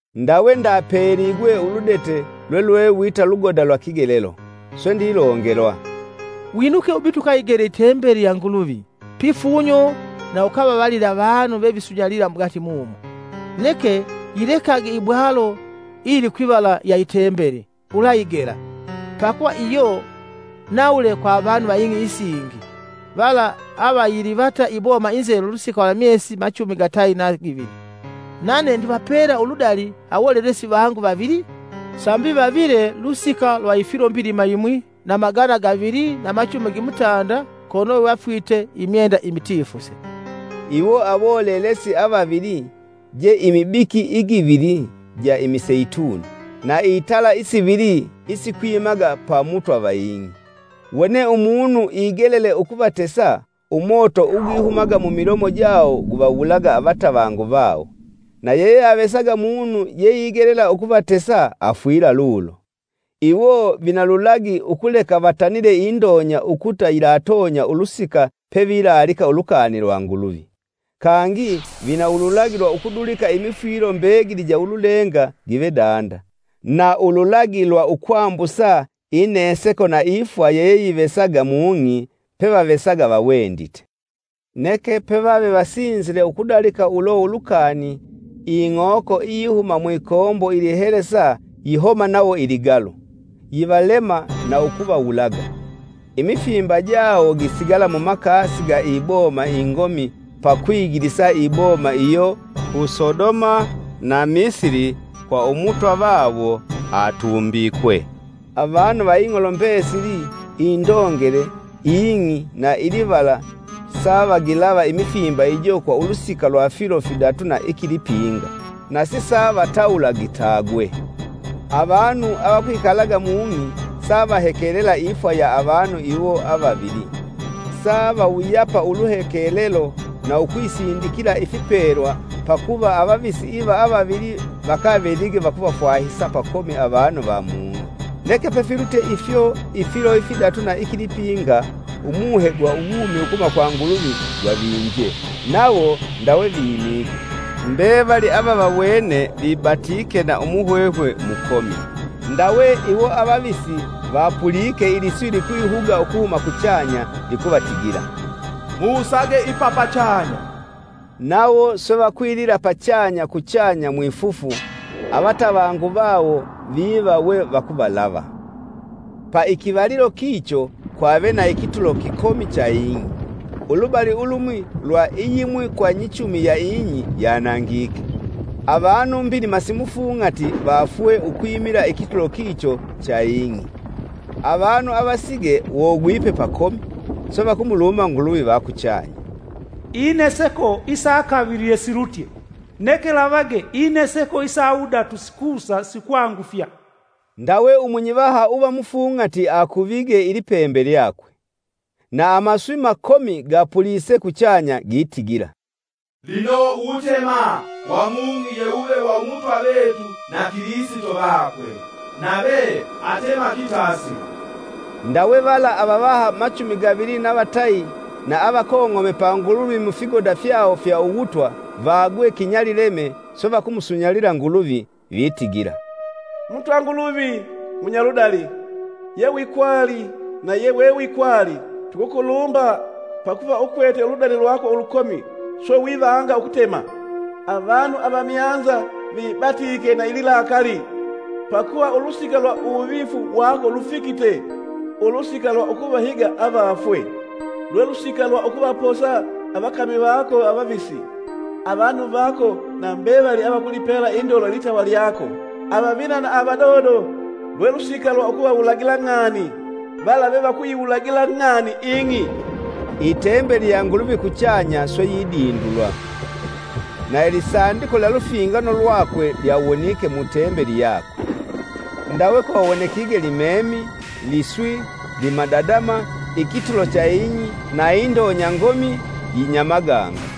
Ndawe ndapeligwe uludete lwelwe wita lugoda lwa kigelelo, swe ndilongelwa, “Winuke ubite ukayigele i tembeli ya Nguluvi, pifunyo, na ukavavalile avanu vevisunyalila mugati mumo. Neke yilekage ibwalo iyilikwivala ya i Tembeli, ulayigela, pakuva iyo nawule kwa avanu va ing'i isingi, vala avayilivata iboma inzelu lusika lwa myesi machumi gatayi na givili. Nane ndivapela uludali awolelesi vangu vavili sambi vavile lusika lwa ifilo mbilima yimwi na magana gavili na machumi gimutanda kono we vafwite imyenda imitifuse.” Iwo awolelesi avavili je imibiki igivili ja imiseituni na itala isivili isikwimaga pa Mutwa va ing'i. Wone umunu igelele ukuvatesa, umoto ugwihumaga mumilomo jawo guvawulaga avatavangu vawo, na yeyeavesaga munu yeigelela ukuvatesa afwila lulo. Iwo vina lulagi ukuleka vatanile indonya ukuta yilatonya ulusika pevilalika ulukani lwa Nguluvi. Kangi vina ululagi lwa ukudulika imifwilo mbegili ja ululenga give danda, na ululagi lwa ukwambusa ineseko na ifwa yeyeyivesaga mung'i pevavesaga vawendite. Neke pevave vasinzile ukudalika ulo ulukani ing'oko iyihuma mwikombo ilihelesa yihoma nawo ligalu, yivalema na ukuvawulaga. Imifimba jawo gisigala mumakasi ga iboma ingomi pa kwigilisa iboma iyo ku Sodoma na Misili kwa Umutwa vave atumbikwe. Avanu va ing'olo mbesili indongele, ing'i na ilivala savagilava imifimba ijo kwa ulusika lwa filo fidatu na ikilipinga, na sisavatawula gitagwe. Avanu avakwikalaga mung'i savahekelela ifwa ya avanu iwo avavili. Savawuyapa uluhekelelo na ukwisindikila ifipelwa pakuva avavisi iva avavili vakavelige vakuvafwahisa pakomi avanu va mung'i. Neke pefilutye ifyo ifilo ifidatu na ikilipinga umuhe gwa uwumi ukuhuma kwa Nguluvi gwavinje, nawo ndawe vimige, mbevali avavawene vibatike na umuhwehwe mukomi. Ndawe iwo avavisi vapulike iliswi likwihuga ukuhuma kuchanya likuvatigila, “Musage ipa pachanya!” Nawo swe vakwilila pachanya kuchanya mwifufu, avatavangu vawo viva we vakuvalava. Pa ikivalilo kicho kwave na ikitulo kikomi cha ing'i, ulubali ulumwi lwa iyimwi kwa nyichumi ya ing'i yanangike. Avanu mbilima simufung'ati vaafwe ukwimila ikitulo kicho cha ing'i. Avanu avasige wogwipe pakomi, swe vakumulumba Nguluvi va kuchanya. Ineseko isa kavili yesilutye, neke lavage! Ineseko isa wudatu sikusa sikwangufya. Ndawe umunyivaha uva mufung'ati akuvige ilipembe lyakwe. Na amaswi makomi gapulise kuchanya gitigila, “Lino uwutema wa mung'i ye wuve wa Umutwa vetu na Kilisito vakwe. Nave atema kitasila.” Ndawe vala avavaha machumi gavili na vatayi na avakong'ome pa Nguluvi mufigoda fyawo fya uwutwa, vagwe kinyalileme, swe vakumusunyalila Nguluvi, Vitigila: “Mutwa Nguluvi munyaludali, yewikwali na yewewikwali! Tukukulumba, pakuva ukwete uludali lwako ulukomi swe vivanga ukutema! Avanu avamyanza vibatiike na ililakali, pakuva ulusika lwa uwuvifu wako lufikite, ulusika lwa ukuvahiga avafwe. Lwe lusika lwa ukuvaposa avakami vako avavisi, avanu vako na mbevali avakulipela indolo litawa lyako, avavina na avadodo. Lwe lusika lwa ukuvawulagila ng'ani vala vevakuyiwulagila ng'ani ing'i.” Itembeli ya Nguluvi kuchanya swe yidindulwa, na Ilisandiko lya Lufingano lwakwe lyawonike mu Tembeli yakwe. Ndawe kwawonekige limemi, liswi, limadadama, ikitulo cha ing'i na indonya ngomi yinyamaganga.